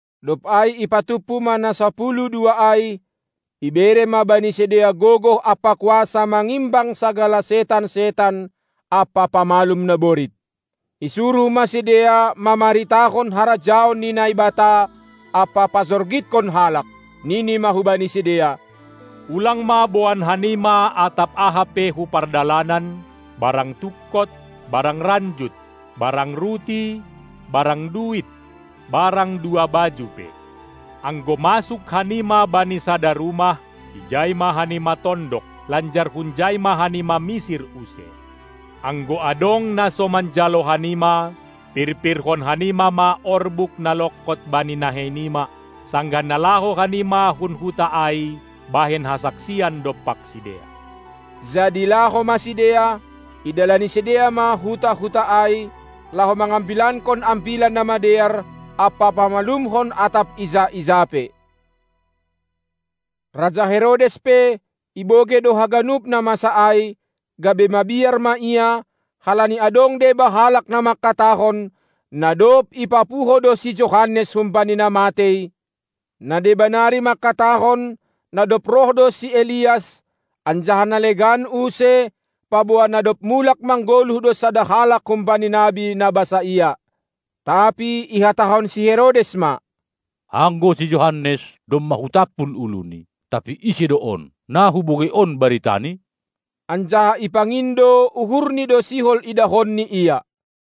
Dob ai ipatumpu ma na sapuluh dua ai; ibere ma bani sidea gogoh ampa kuasa mangimbang sagala setan-setan ampa pamalum naborit. Isuruh ma sidea mamaritahon harajaon ni Naibata ampa pajorgithon halak. Nini ma hubani sidea: Ulang ma boan hanima atap aha pe hu pardalanan, barang tungkot, barang ranjut, barang ruti, barang duit, barang dua baju pe. Anggo masuk hanima bani sada rumah, ijai ma hanima tondok, lanjar hunjai ma hanima misir use. Anggo adong na so manjalo hanima, pirpirhon hanima ma orbuk na longkot bani nahei nima, sanggah na laho hanima hun huta ai bahen hasaksian dompak sidea. Jadi laho ma sidea, idalani sidea ma huta-huta ai, laho mangambilankon Ambilan Namadear, ampa pamalumhon atap ija-ija pe. Raja Herodes pe, ibogei do haganup na masa ai, gabe mabiar ma ia, halani adong deba halak na mangkatahon, na dob ipapuho do si Johannes humbani na matei; na deba nari mangkatahon na dob roh do si Elias, anjaha na legan use, paboa na dob mulak manggoluh do sada halak humbani nabi na basaia. Tapi ihatahon si Herodes ma: Anggo si Johannes domma hutampul uluni, tapi ise do on, na hubogei on baritani? Anjaha ipangindo uhurni do sihol idahonni Ia.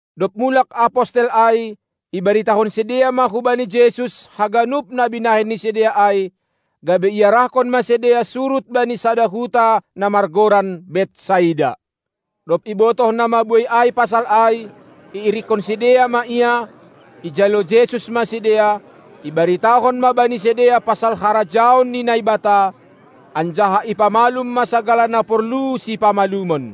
Dob mulak apostel ai ibaritahon sidea ma hubani Jesus haganup na binahen ni sidea ai, gabe iarahkon ma sidea surut bani sada huta na margoran Betsaida. Dob ibotoh na mabuei ai pasal ai, irikkon sidea ma Ia; ijalo Jesus ma sidea, ibaritahon ma bani sidea pasal harajaon ni Naibata, anjaha ipamalum ma sagala na porlu sipamalumon.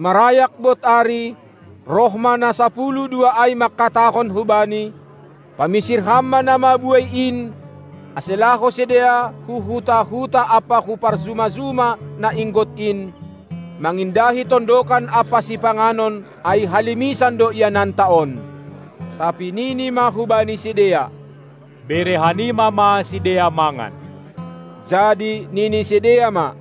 Marayak bod ari, roh ma na sapuluh dua ai mangkatahon hu Bani; Pamisir Ham ma na mabuei in, ase laho sidea hu huta-huta ampa hu parjuma-juma na inggot in, mangindahi tondokan ampa sipanganon, ai halimisan do iananta on. Tapi nini ma hubani sidea: Bere hanima ma sidea mangan! Jadi nini sidea ma: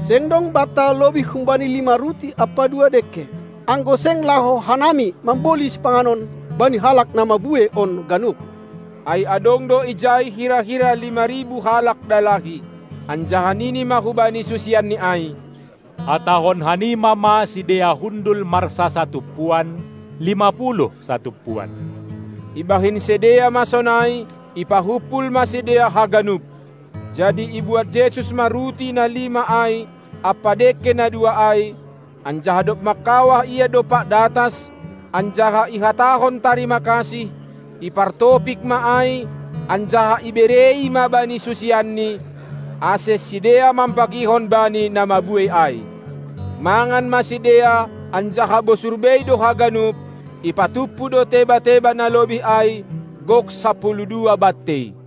Seng dong banta lobih humbani lima ruti ampa dua dengke, anggo seng laho hanami mamboli sipanganon bani halak na mabuei on ganup. Ai adong do ijai hira-hira lima ribu halak dalahi. Anjaha nini ma hubani susianNi ai: Hatahon hanima ma sidea hundul marsasatumpuan, lima puluh satumpuan. Ibahen sidea ma sonai, ipahumpul ma sidea haganup. Jadi ibuat Jesus ma ruti na lima ai ampa dengke na dua ai, anjaha dob mangkawah Ia dompak datas anjaha ihatahon tarimakasih, ipartopik ma ai, anjaha iberei ma bani susianNi, ase sidea mambagihon bani na mabuei ai. Mangan ma sidea anjaha bosur bei do haganup; ipatumpu do teba-teba na lobih ai, gok sapuluh dua bantei.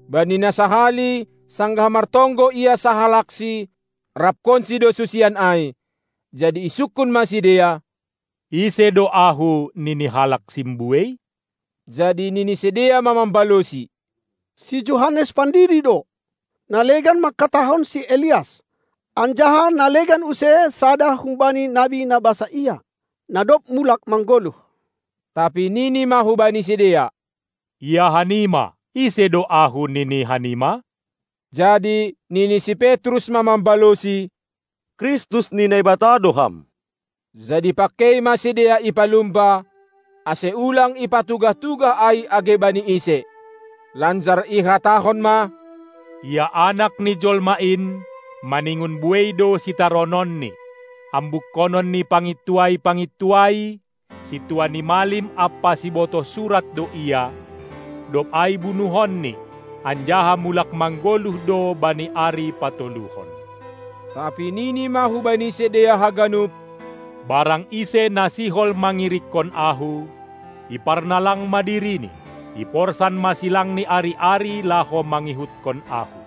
Bani na sahali, sanggah martonggo Ia sahalaksi, rapkonsi do susian ai. Jadi isungkun ma sidea: Ise do Ahu, nini halak simbuei? Jadi nini sidea ma mambalosi: Si Johannes pandidi do; na legan mangkatahon si Elias, anjaha na legan use sada humbani nabi na basaia, na dob mulak manggoluh. Tapi nini ma hubani sidea: Ia hanima, ise do Ahu nini hanima? Jadi nini si Petrus ma mambalosi: Kristus ni Naibata do Ham! Jadi pangkei ma sidea ipalumba, ase ulang ipatugah-tugah ai age bani ise. Lanjar ihatahon ma: Ia Anak ni Jolma in, maningon buei do sitarononNi, ambukkonon ni pangintuai-pangintuai, sintua ni malim ampa sibotoh surat do Ia, dob ai bunuhonni, anjaha mulak manggoluh do bani ari patoluhon. Tapi nini ma hubani sidea haganup: Barang ise na sihol mangirikkon Ahu, iparnalang ma dirini, iporsan ma silangni ari-ari laho mangihutkon Ahu.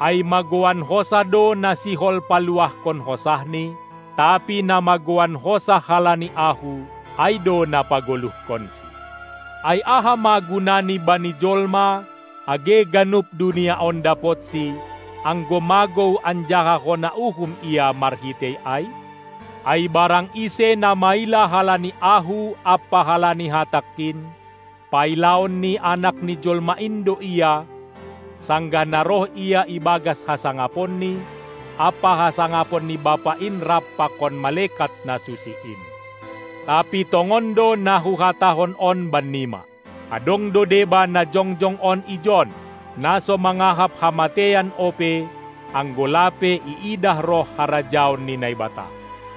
Ai magouan hosah do na sihol paluahkon hosahni, tapi na magouan hosah halani Ahu, ai do na pagoluhkonsi. Ai aha ma gunani bani jolma, age ganup dunia on dapotsi, anggo magou anjaha hona uhum ia marhitei ai? Ai barang ise na maila halani Ahu ampa halani hatangKin, pailaon ni Anak ni jolma in do ia, sanggah na roh Ia ibagas hasangaponNi ampa hasangapon ni Bapa in rap pakon malekat na susi in. Tapi tongon do na Huhatahon on bannima: Adong do deba na jongjong on ijon, na so mangahap hamateian ope, anggo lape iidah roh harajaon ni Naibata.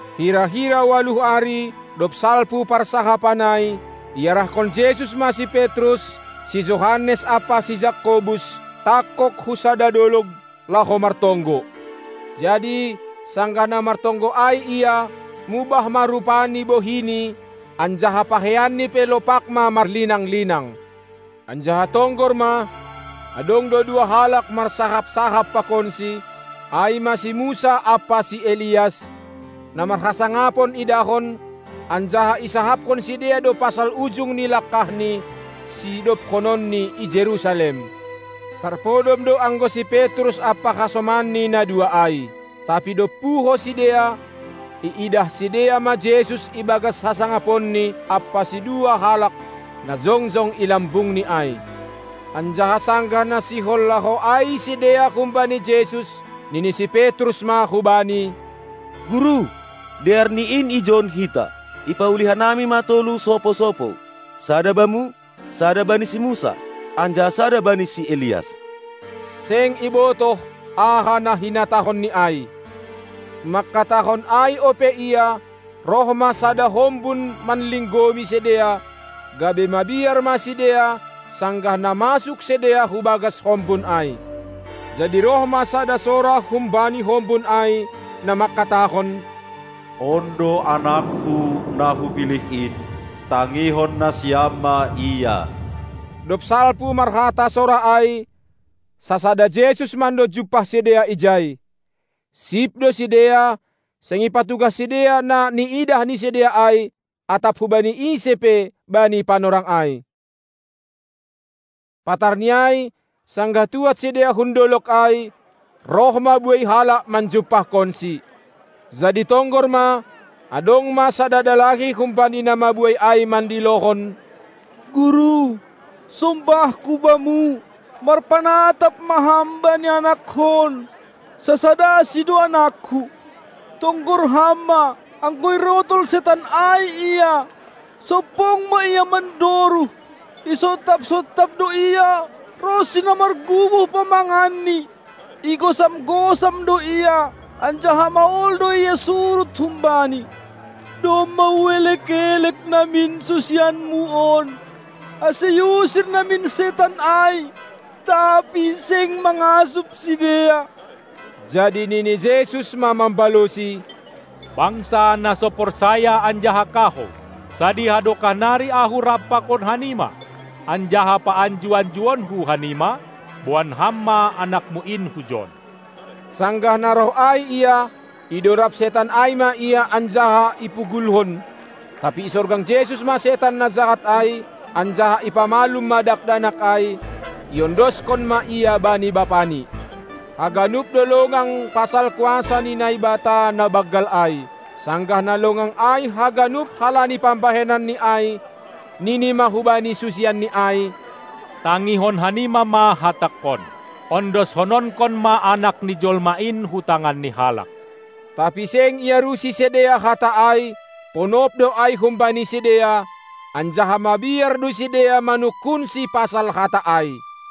Hira-hira ualuh ari, dob salpu parsahapan ai, iarahkon Jesus ma si Petrus, si Johannes ampa si Jakobus tangkog hu sada dolog, laho martonggo. Jadi, sanggah na martonggo ai Ia, mubah ma rupa ni bohiNi, anjaha pakeianNi pe lopak ma marlinang-linang. Anjaha tonggor ma, adong do dua halak marsahap-sahap pakonSi, ai ma si Musa ampa si Elias, na marhasangapon idahon, anjaha isahapkon sidea do pasal ujung ni langkahNi, sidobkononNi i Jerusalem. Tarpodom do anggo si Petrus ampa hasomanni na dua ai. Tapi dob puho sidea, iidah sidea ma Jesus ibagas hasangaponNi ampa sidua halak, na jongjong i lambungNi ai. Anjaha sanggah na sihol laho ai sidea humbani Jesus, nini si Petrus ma hu Bani: Guru, dearni in ijon hita! Ipauli hanami ma tolu sopou-sopou, sada Bamu, sada bani si Musa anjaha sada bani si Elias; seng ibotoh, aha na hinatahon ni ai. Mangkatahon ai ope ia, roh ma sada hombun manlinggomi sidea, gabe mabiar ma sidea, sanggah na masuk sidea hubagas hombun ai. Jadi roh ma sada sora humbani hombun ai, na mangkatahon: On do AnakKu, na Hupilih in, tangihon nasiam ma Ia! Dob salpu marhata sora ai, sasada Jesus mando jumpah sidea ijai. Sip do sidea, seng ipatugah sidea na niidah ni sidea ai atap hubani ise pe bani panorang ai. Patarni ai, sanggah tuad sidea hun dolog ai, roh ma buei halak manjumpahkonSi. Jadi tonggor ma, adong ma sada dalahi humbani na mabuei ai mandilohon: Guru, sombahku Bamu, marpanatap ma Ham bani anakkon, sasadasi do anakku. Tonggor Ham ma, anggo irotol setan ai ia, sompong ma ia mandoruh; isontap-sontap do ia ronsi na marguboh pamanganni; igosam-gosam do ia, anjaha mahol do ia surut humbani. Domma huelek-elek namin susianmu on, ase iusir namin setan ai, tapi seng mangasup sidea. Jadi nini Jesus ma mambalosi: Bangsa, na so porsaya anjaha kahou! Sadiha dokah nari Ahu rap pakon hanima, anjaha paanju-anjuonKu hanima? Boan ham ma anakmu in hujon! Sanggah na roh ai ia, idorab setan ai ma ia anjaha ipugulhon. Tapi isorgang Jesus ma setan na jahat ai anjaha ipamalum ma dakdanak ai; iondoskon ma ia bani bapani. Haganup do longang pasal kuasa ni Naibata na banggal ai. Sanggah na longang ai haganup halani pambahenanni ai, Nini ma hubani susianNi ai: Tangihon hanima ma hatangKon: Ondoshononkon ma Anak ni Jolma in hu tangan ni halak. Tapi seng iarusi sidea hata ai, ponop do ai humbani sidea; anjaha mabiar do sidea manungkunSi pasal hata ai.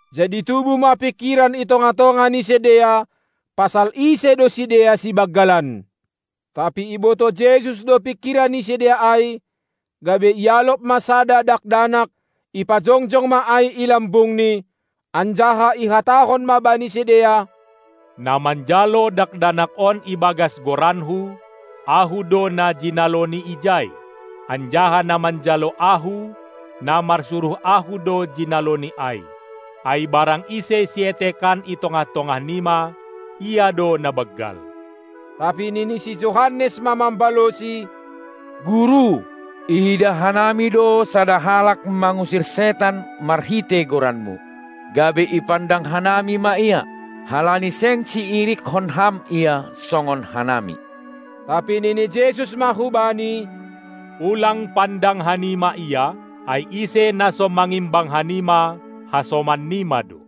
Jadi tubuh ma pingkiran i tongah-tongah ni sidea pasal ise do sidea sibanggalan. Tapi ibotoh Jesus do pingkiran ni sidea ai, gabe ialop ma sada dakdanak, ipajongjog ma ai i lambungNi, anjaha ihatahon ma bani sidea: Na manjalo dakdanak on ibagas goranKu, Ahu do na jinaloni ijai, anjaha na manjalo Ahu, na marsuruh Ahu do jinaloni ai. Ai barang ise sietekan i tongah-tongah nima, ia do na banggal. Tapi nini si Johannes ma mambaloSi: Guru, iidah hanami do sada halak mangusir setan marhitei goranMu, gabe ipandang hanami ma ia, halani seng siirikkon Ham ia songon hanami. Tapi nini Jesus ma hubani: Ulang pandang hanima ia, ai ise na so mangimbang hanima, hasoman nima do.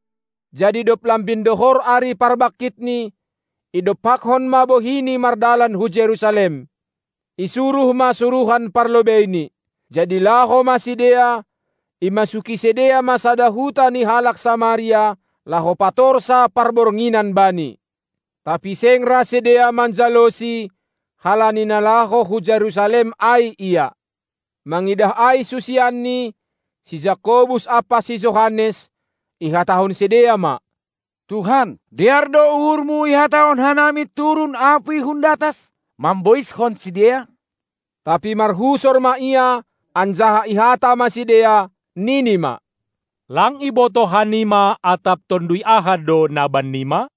Jadi dob lambin dohor ari parbankitNi, idompakkon ma bohiNi mardalan hu Jerusalem. Isuruh ma suruhan parlobeiNi. Jadi laho ma sidea, imasuki sidea ma sada huta ni halak Samaria, laho patorsa parbornginan Bani. Tapi seng ra sidea manjaloSi, halani na laho hu Jerusalem ai Ia. Mangidah ai susianNi, si Jakobus ampa si Johannes, ihatahon sidea ma: Tuhan, dear do uhurMu ihatahon hanami turun apuy hun datas, mamboiskon sidea? Tapi marhusor ma Ia, anjaha ihata ma sidea, nini ma: Lang ibotoh hanima, atap tonduy aha do na bannima?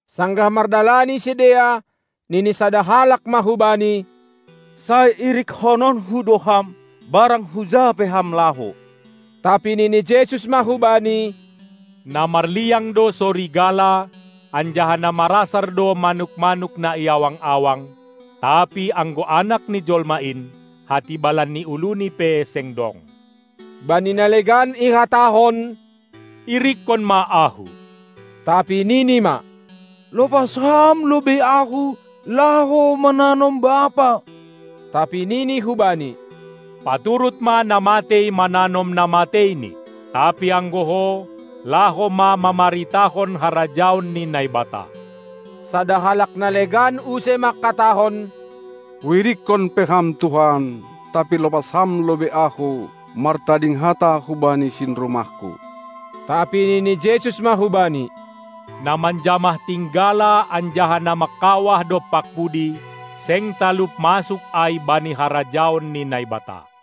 Sanggah mardalani sidea, nini sada halak ma hu Bani: Sai irikononku do Ham, barang huja pe Ham laho! Tapi nini Jesus ma hubani: Na marliang do sorigala, anjaha na marasar do manuk-manuk na i awang-awang, tapi anggo Anak ni jolma in, hatibalan ni uluni pe seng dong. Bani na legan ihatahon: Irikkon ma Ahu! Tapi nini ma: Lopas Ham lobei ahu, laho mananom bapa! Tapi nini hubani: Paturut ma na matei mananom na mateini, tapi anggo ho, laho ma mamaritahon harajaon ni Naibata. Sada halak na legan use mangkatahon: Huirikkon pe Ham Tuhan, tapi lopas Ham lobei ahu martading hata hubani sinrumahku. Tapi nini Jesus ma hubani: Na manjamah tinggala anjaha na mangkawah dompak pudi, seng talup masuk ai bani harajaon ni Naibata.